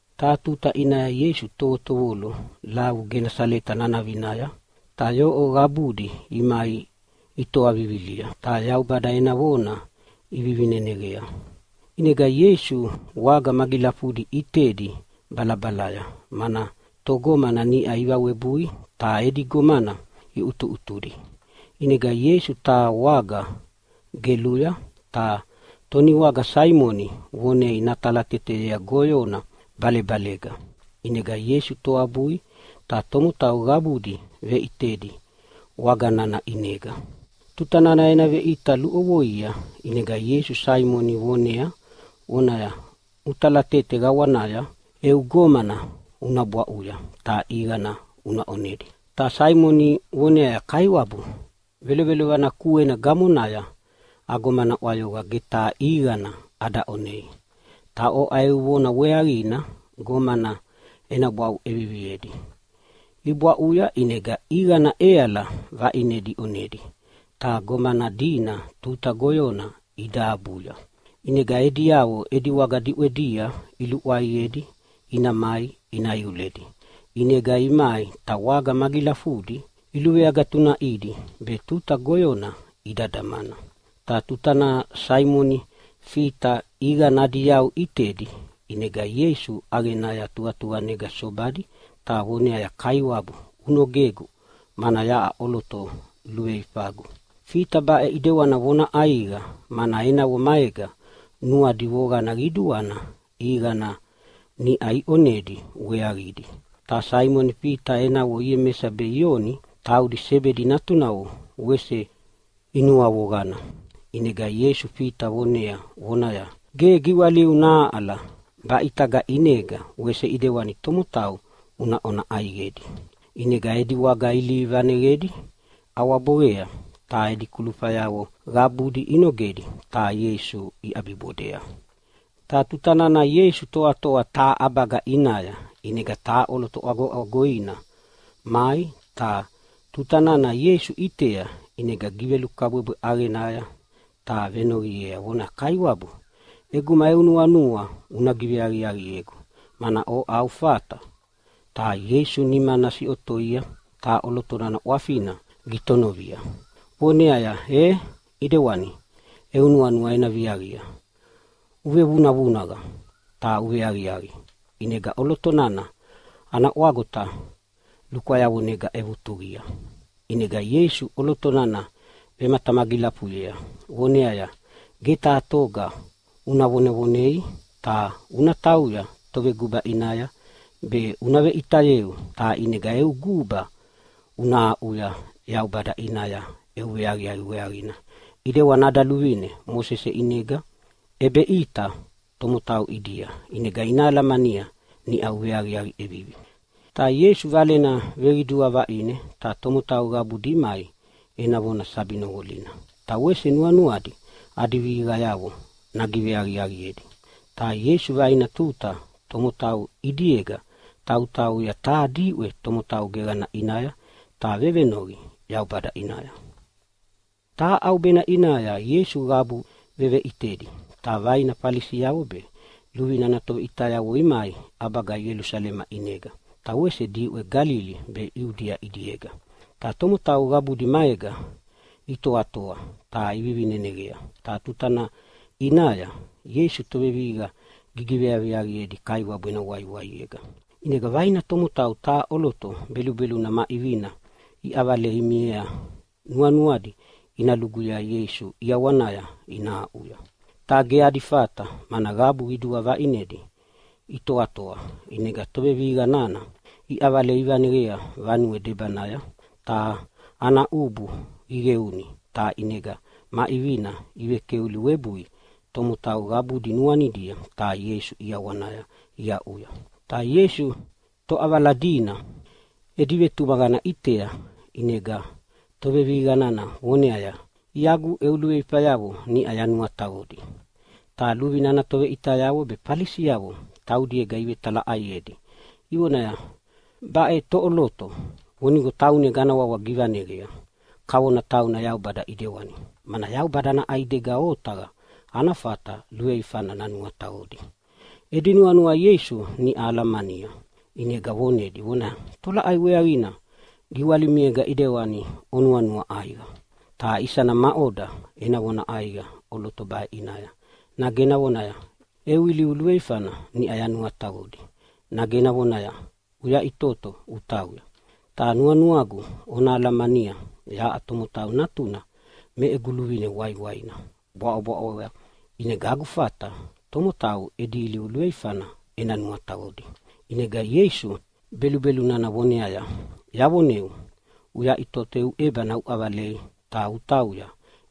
Taha tuta ʼinaya Ieisu tovotovolo lavu Genasaleta nanavinaya ta yoʼo qabudi imai itoa vivilia ta Yaubada ena vona ivivineneqea. ʼInega Ieisu waga magilafudi ʼitedi balabalaya mana togomana niʼa ivawebui ta edi gomana iʼutuʼutudi. ʼInega Ieisu taha waga geluya, ta toniwaga Saimoni vonei natalateteyea goyona balebalega. ʼInega Ieisu toabui ta tomotau qabudi veʼitedi waga nana ʼinega. Tuta nana ena veʼita luʼovoia ʼinega Ieisu Saimoni vonea vonaya, “Una talatete qawanaya eu gomana una bwaʼuya ta ʼiqana una ʼonedi.” Ta Saimoni voneaya, “Kaiwabu, velovelovana kuena gamonaya agomana ʼwayoqa, ge taha ʼiqana ada ʼonei! Ta oʼa eu vona weaqina gomana ena bwaʼu ʼeviviedi.” Ibwaʼuya ʼinega ʼiqana ʼeala vaʼinedi iʼonedi ta gomana dina tuta goyona ida abuya. ʼInega ediavo edi waga diʼwedia iluʼwayedi ina mai ina iuledi. ʼInega imai ta waga magilafudi iluveagatunaʼidi be tuta goyona ida damana. Ta tutana Saimoni Fita ʼiqana adi yau ʼitedi, ʼinega Ieisu ʼaqenaya tuqatuqanega sobadi ta voneaya, “Kaiwabu unogegu, mana yaʼa ʼoloto luveifagu.” Fita baʼe ʼidewana vona ʼaiqa mana enavo maega nuadi voqana qiduana ʼiqana niʼa iʼonedi weaqidi, ta Saimoni Fita enavo Iemesa be Ioni taudi Sebedi natunavo wese inuavoqana. ʼInega Ieisu Fita vonea vonaya, “Ge giwaliu nahaʼala, baʼe ʼitaga ʼinega wese ʼidewani tomotau una ʼona ʼaiqedi.” ʼInega edi waga ilihi vaneyedi ʼawaboqea, ta edi kulufayavo qabudi inogedi ta Ieisu iʼabibodea. Ta tutana Ieisu toatoa taha ʼabaga ʼinaya, ʼinega taha ʼoloto ʼwagoʼwagoina mai. Ta tuta nana Ieisu ʼitea ʼinega givelukabwebwe ʼaqenaya ta venoqiea vonaya, “Kaiwabu, ʼeguma eu nuanua una giveaqiaqiegu, mana oʼa au fata!” Ta Ieisu nimana siʼotoia ta ʼoloto nana ʼwafina gitonovia voneaya, “E ʼidewani, eu nuanua ena viaqia, uvevunavunaqa ta uveaqiaqi!” ʼInega ʼoloto nana ana ʼwagota lukwayavonega ʼevutuqia. ʼInega Ieisu ʼoloto nana vematamagilafuyea voneaya, “Ge taha toga una vonevonei, ta una tauya toveguba ʼinaya be una veʼitayeu. Ta ʼinega eu guba una aʼuya Yaubada ʼinaya eu veaqiaqi weaqina ʼidewana ada luvine Mosese ʼinega ʼebeʼita tomotau ʼidia. ʼInega ina alamania niʼa uveaqiaqi ʼevivi.” Ta Ieisu Valena veqidua vaʼine ta tomotau qabudi imai ena vona sabi noqolina, ta wese nuanuadi adi vihiqayavo nagiveaqiaqiedi. Ta Ieisu vaina tuta tomotau ʼidiega tautauya taha diʼwe tomotau geqana ʼinaya ta vevenoqi Yaubada ʼinaya. Taha ʼaubena ʼinaya Ieisu qabu veveʼitedi. Ta vaina Falisiavo be luvine ana toveʼitayavo imai ʼabaga Ielusalema ʼinega ta wese diʼwe Galili be Iudia ʼidiega, ta tomotau qabudi maega itoatoa ta ivivineneqa. Ta tutana ʼinaya Ieisu tovevihiqa giveaqiaqiedi Kaiwabu ena waiwaiega. ʼInega vaina tomotau taha ʼoloto belubeluna ma ʼivina iʼavalei imiea nuanuadi ina luguyea Ieisu ʼiawanaya ina aʼuya. Ta ge adi fata mana qabu qidua vaʼinedi itoatoa, ʼinega tovevihiqa nana iʼavalei ivaneqea vanue debanaya, ta ana ʼubu iqeuni ta ʼinega ma ʼivina ivekeuli webui tomotau qabudi nuanidia ta Ieisu ʼiawanaya iaʼuya. Ta Ieisu toʼavala dina edi vetumaqana ʼitea, ʼinega tovevihiqa nana voneaya, “Iagu, eu luveifayavo niʼa yanuataqodi.” Ta luvine ana toveʼitayavo be Falisiavo taudiega ivetalaʼaiedi ivonaya, “Baʼe toʼoloto, vonigo taunega ana wawa givaneqea kavona tauna Yaubada ʼidewani. Mana Yaubada ana ʼaidega otaqa ana fata luveifana nanuataqodi.” Edi nuanua Ieisu niʼau alamania ʼinega vonedi vonaya, “Tolaʼai weaqina giwalimiega ʼidewani onuanua ʼaiqa? Ta isana maʼoda ena vona ʼaiqa ʼoloto baʼe ʼinaya, nage ena vonaya, ‘Eu ilivu luveifana niʼau yanuataqodi’, nage ena vonaya, ‘Uyaʼitoto utauya’? Ta nuanuagu ona alamania yaʼa Tomotau Natuna me egu luvine waiwaina bwaʼobwaʼoya, ʼinega agu fata tomotau edi ilivu luveifana ena nuataqodi.” ʼInega Ieisu belubelu nana voneaya, “Yavoneu, uyaʼitoto eu ʼebana uʼavalei ta utauya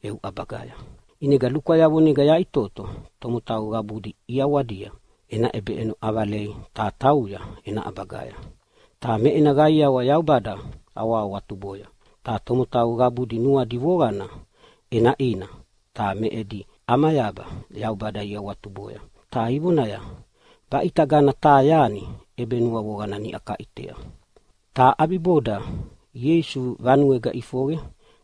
eu ʼabagaya.” ʼInega lukwayavonega yaʼitoto tomotau qabudi ʼiawadia ena ʼebeʼeno ʼavalei ta tauya ena ʼabagaya, ta me ena qaiawa Yaubada awahawatuboya. Ta tomotau qabudi nuadi voqana ʼenaʼina ta me edi ʼamayaba Yaubada iawatuboya ta ivonaya, “Baʼitagana taha yani ʼebenuavoqana niʼa kaʼitea.” Ta ʼabiboda Ieisu vanuega ʼifoqe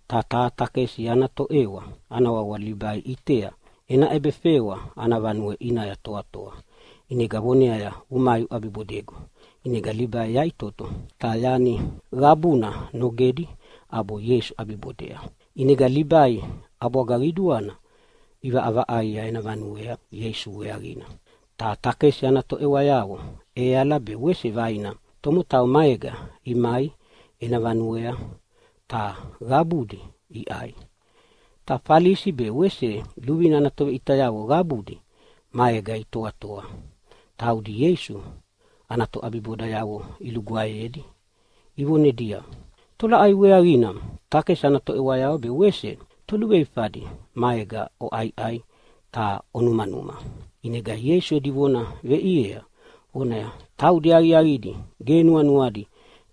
ta taha takesi ana toʼewa ana wawa Libai ʼitea ena ʼebefewa ana vanue ʼinaya toatoa, ʼinega voneaya, “Umai, uʼabibodegu!” ʼInega Libai yaʼitoto ta yani qabuna nogedi ʼabo Ieisu ʼabibodea. ʼInega Libai ʼabwaga qiduana ʼivaʼavaʼaia ena vanuea Ieisu weaqina. Ta takesi ana toʼewayavo ʼeala be wese vaina tomotau maega imai ena vanuea, ta qabudi iʼai. Ta Falisi be wese luvine ana toveʼitayavo qabudi maega itoatoa. Taudi Ieisu ana toʼabibodayavo ilugwaeyedi ivonedia, “Tolaʼai weaqina takesi ana toʼewayavo be wese toluveifadi maega oʼaiʼai ta onumanuma?” ʼInega Ieisu edi vona veʼiea vonaya, “Taudi aqiaqidi ge nuanuadi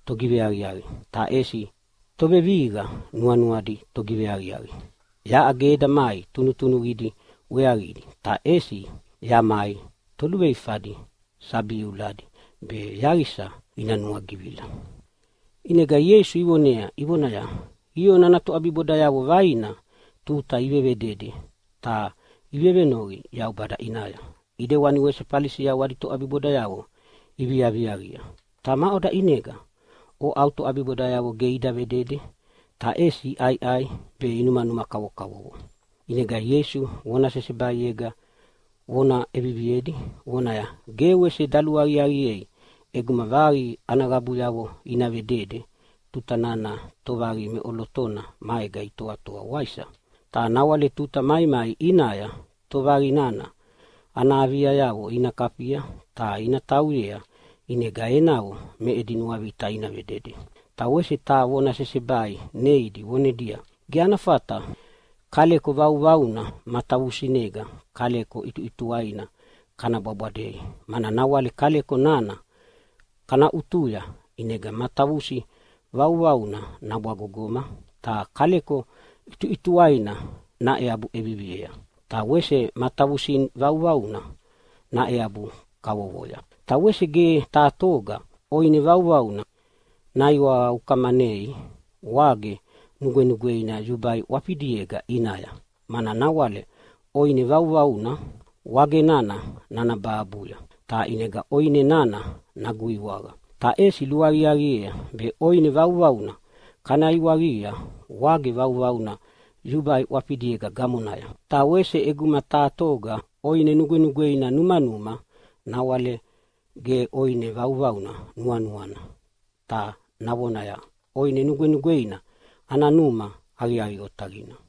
togiveaqiaqi, ta ʼesi tovevihiqa nuanuadi togiveaqiaqi. Yaʼa ge eda mai tunutunuqidi weaqidi, ta ʼesi yamai toluveifadi sabi iuladi be yaqisa ina nuagivila.” ʼInega Ieisu ivonea ivonaya, “Ioni ana toʼabibodayavo vaina tuta ivevedede ta ivevenoqi Yaubada ʼinaya. ʼIdewani wese Falisiavo adi toʼabibodayavo iviaviaqia. Ta maʼoda ʼinega oʼa au toʼabibodayavo ge ida vedede, ta ʼesi iʼaiʼai be inumanuma kavokavovo?” ʼInega Ieisu vona sesebaiega vona ʼeviviedi vonaya, “Ge wese daluaqiaqiea ʼeguma vaqi ana qabuyavo ina vedede tuta nana tovaqi meʼolotona maega itoatoa, waisa? Ta nawale tuta maimai ʼinaya tovaqi nana ana aviayavo ina kafia ta ina tauyea, ʼinega enavo me edi nuavita ina vedede.” Ta wese taha vona sesebai neidi vonedia, “Ge ana fata kaleko vauvauna matavusinega kaleko ʼituʼituwaina kana bwabwadei, mana nawale kaleko nana kana ʼutuya ʼinega matavusi vauvaunana nabwagogoma ta kaleko ʼituʼituwaina naeabu ʼeviviea, ta wese matavusina vauvaunana naeabu kavovoya. Ta wese ge taha toga ʼoine vauvauna naiwaqa ukamanei wage nugwenugweina yubai ʼwafidiega ʼinaya, mana nawale ʼoine vauvauna wage nana nanabahabuya ta ʼinega ʼoine nana naguiwaqa. Ta ʼesi luaqiaqiea be ʼoine vauvauna kana iwaqia wage vauvauna yubai ʼwafidiega gamonaya. Ta wese ʼeguma taha toga ʼoine nugwenugweina numanuma nawale ge ʼoine vauvauna nuanuana ta navonaya, ‘ʼOine nugwenugweina ana numa aqiaqi otaqina.’”